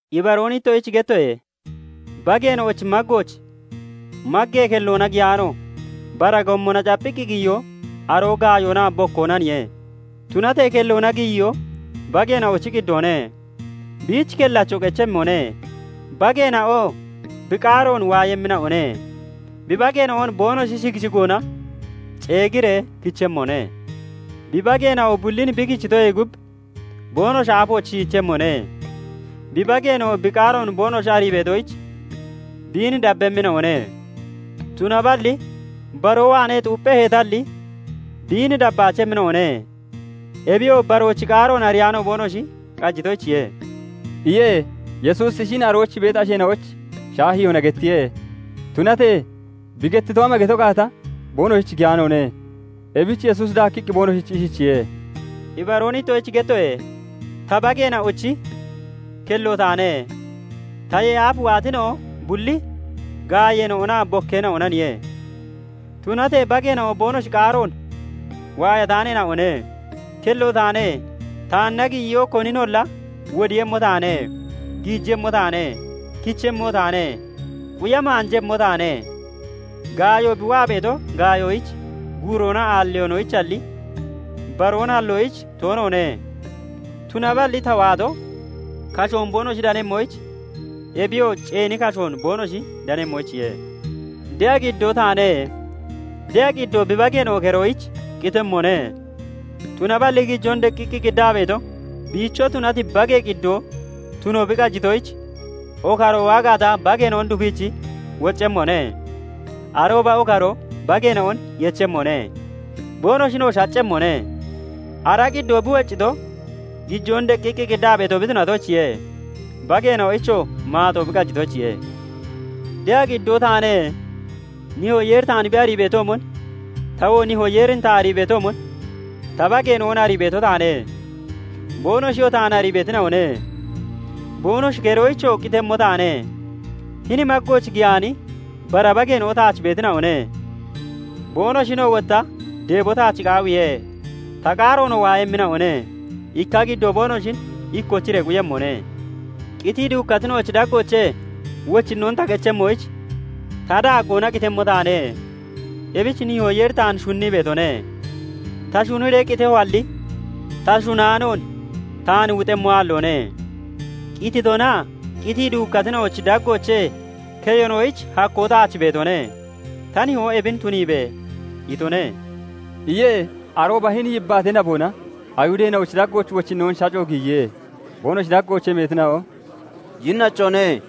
"Ibaroon ittoshich gettoye:- bageena'ochi maggooch maggee kelloona giyaano, bara gommona capphiqqi giyiyo, aroo gaayoonaa bokkoonaniye. Tunatee kelloona giyiyoo bageena'ochi qiddoone. Biich kellacho qechemmone. Bageena'oo bi qaaroon waayemmina'one; bi bageena'on boonoshi shigi shigoona ceegiree kichemmone. Bi bageena'o bullin bi kichitoyee gub boonoshi aafooch shiichemmone; bi bageena'oo bi qaaroon boonoshi arii beetoyich, biin dabbemmina'one. Tunaballi baroo waanee xuuppheheetalli biin dabbaachemmina'one; Ebiyoo baroochi qaaroon ariyaano boonoshi qajitoyichiye" iye. Yesuusi ishin arooch beeti asheena'oyich shaahiyoona gettiye; tunatee bi gettito ama geto gaata boonoshich giyaanoone. Ebich Yesuusi daakkiqqi boonoshich ishichiye:- "Ibaroon ittoshich gettoye:- Ta, bageena'ochi kello taane. [Taye aaf] waatina'o bulli gaayeena'onaa bokkeena'onaniye; tunatee bageena'o boonoshi qaaroon waayataaneena'one. Kello taane. Taanna giyiyoo koninolla wodiiyemmo taane. Giijemmo taane; kichemmo taane; quya maanjemmo taane. Gaayo bi waa beeto gaayoyich, guuroonaa aalliyoonoyichalli, baroon halloyich toonoone; tunaballi ta waato, kashoon boonoshi danemmoyich, ebiyoo ceeni kashoon boonoshi danemmoyichiye. "De'a qiddoo taane. De'a qiddoo bi bageena'o keroyich qitemmone. Tunaballi gijoon deqqiqqi qiddaa beeto biicho tunati bagee qiddoo tuno bi qajitoyich, okaroo waa gaata bageena'on dufiichi woccemmone; arooba okaroo bageena'on yechemmone; boonoshinoo shaccemmone. Ara qiddoo bi woccito, gijoon deqqiqqi qiddaa beeto bi tunatoyichiye; bageena'oyichoo maaxo bi qajitoyichiye. "De'a qiddoo taane. Nihoo Yeeri taan bi arii beetoomon, tawoo Nihoo Yeerin ta arii beetoomon ta bageena'on arii beeto taane; boonoshiyoo taan arii beetina'one; boonoshi keroyichoo qitemmo taane. Hini maggooch giyaani bara bageena'o taach beetina'one. Boonoshinoo wotta deebo taach qaawiihe; ta qaaroonoo waayemmina'one; ikka qiddoo boonoshin ikkochiree quyemmone. "Qitii duukkatina'ochi daggoochee wochinnoon ta kechemmoyich, ta daaggoona qitemmo taane; ebich Nihoo Yeeri taan shunnii beetone. Ta shunniree qitehoalli, ta shunnaanoon taan wuxemmo aalloone. Qitoonaa qitii duukkatina'ochi daggoochee keyonoyich hakkoo taach beetone; ta Nihoo 'Ebin tuniibe!' itone" iye. Arooba hini yibbaatee naboona Ayihudeena'ochi daggooch wochinnoon shaco giyiye. Boonoshi daggoochee meetina'o "Yinnachone!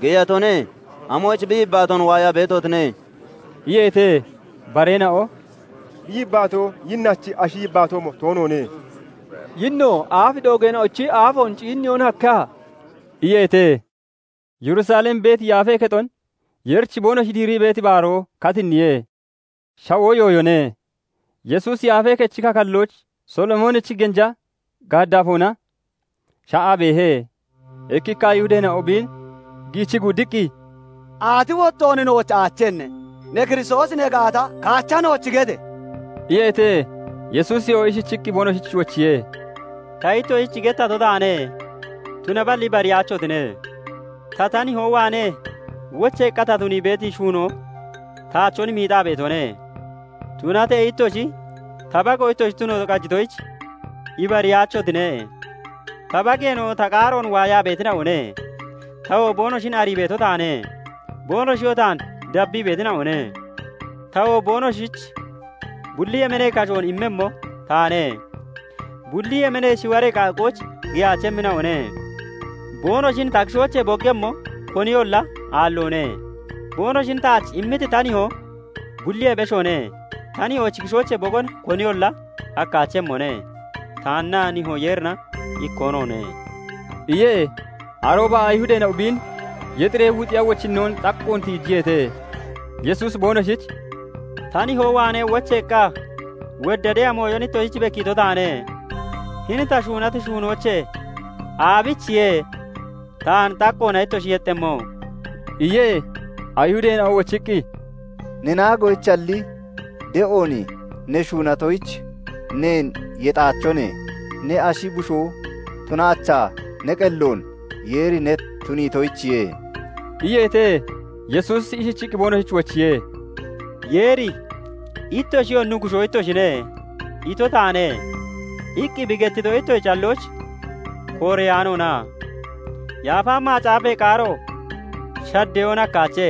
Geyatone! Amoyich bi yibbaatoon waayaa beetotine?" iyeete. Bareena'o "Bi yibbaatoo yinnachi ashi yibbaatoomo toonoone. Yinno aaf doogeena'ochi aafoon ciinniyoon hakkeha?" iyeete. Yerusalem beeti yaafee kexon Yeerich boonoshi diirii beeti baaroo katinniye. Shawoo yooyone. Yesuusi Yaafee Kechi kakallooch Solomoonichi genja gaaddaafoona sha'aa beehe. Ikkikka Ayihudeena'o biin giichii guuddiqqi, "Aati wottoon nooch aachenne? Ne Kiristoosi ne gaata, kaacha nooch gete!" iyeete. Yesuusiyoo ishichiqqi boonoshich wochiye:- "Ta ittoshich gettato taane; tunaballi ibariyaachotine. Ta, ta nihoo waanee wocheeqqa ta tunii beeti shuunoo taachon miixaa beetone; Tunatee ittoshi ta bago ittoshi tuno qajitoyich ibariyaachotine. Ta bageena'o ta qaaroon waayaa beetina'one; tawoo boonoshin arii beeto taane; boonoshiyoo taan dabbii beetina'one. Tawoo boonoshich bulli yemeenee kashoon immemmo taane; bulli yemeenee shiwaree qaaqqooch giyaachemmina'one. Boonoshin ta kishoochee boggemmo koniyolla aalloone. Boonoshin taach immiti ta Nihoo bulliyee beshoone; ta Nihoochi kishoochee bogon koniyolla hakkaachemmone. Taannaa Nihoo Yeerina ikkoo noone" iye. Arooba Ayihudeena'o biin yexiree wuxiya wochinnoon xaqqoon tiijiyeete. Yesuusi boonoshich "Ta nihoo waanee wocheeqqa wodda de'a mooyon ittoshich bekkiito taane; hini ta shuunati shuunoochee aabichiye taan xaqqoona ittoshi yexxemmo?" iye. Ayihudeena'o wochiqqi, "Ne naagoyichalli de'oon ne shuunatoyich neen yexaachone; ne ashi bushoo tunaachaa ne qelloon Yeeri ne tuniitoyichiye" iyeete. Yesuusi ishichiqqi boonoshich wochiye:- "Yeeri ' "Ittoshiyoo nuggushoo ittoshine" ito taane' iqqi bi gettito ittoshi callooch kooreyaanoona? Yaafa Macaafee qaaro shaddeyoon hakkaache;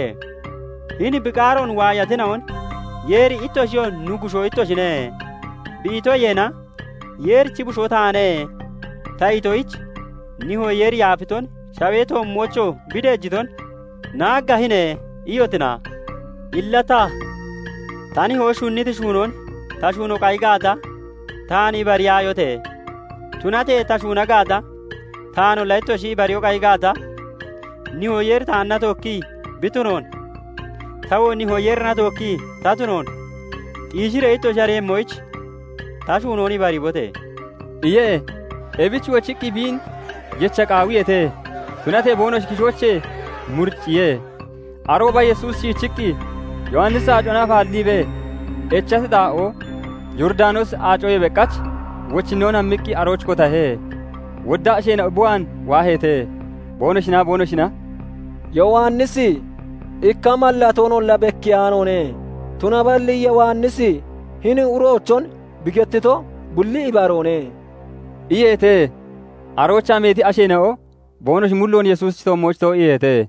hini bi qaaroon waayatina'on, Yeeri 'Ittoshiyoo nuggushoo ittoshine' bi itoyeena, 'Yeerichi Bushoo taane' ta itoyich Nihoo Yeeri yaafiton, shawee toommoochoo bi deejiton 'Naaggaahine!' iyotina? Illa ta, ta Nihoo shunniti shuunoon ta shuuno qayi gaata, taan ibariyaayote! Tunatee ta shuuna gaata, taanolla ittoshi ibariyoo qayi gaata, Nihoo Yeeri taanna tookkii bi tunoon, tawoo Nihoo Yeerina tookkii ta tunoon xiishiree ittoshi ariiyemmoyich, ta shuunoon ibariibote!" iye. Ebich wochiqqi biin yecha qaawiyeete; tunatee boonoshi kishoochee muricciye. Arooba Yesuusi shiichiqqi Yowannisi aacona afaalliibee echati xaa'oo Yooridanoosi Aacoyee beqach wochinnoon hammiqqi arooch kotahe. Wodda asheena'o bi waan waaheete. Boonoshinaa boonoshina "Yowannisi ikka mallatoonolla bekiyaanoone; tunaballi Yowannisi hini uroochon bi gettito bulli ibaroone" iyeete. Aroochaa meeti asheena'o boonoshi mulloon Yesuusichi toommooch too'iiheete.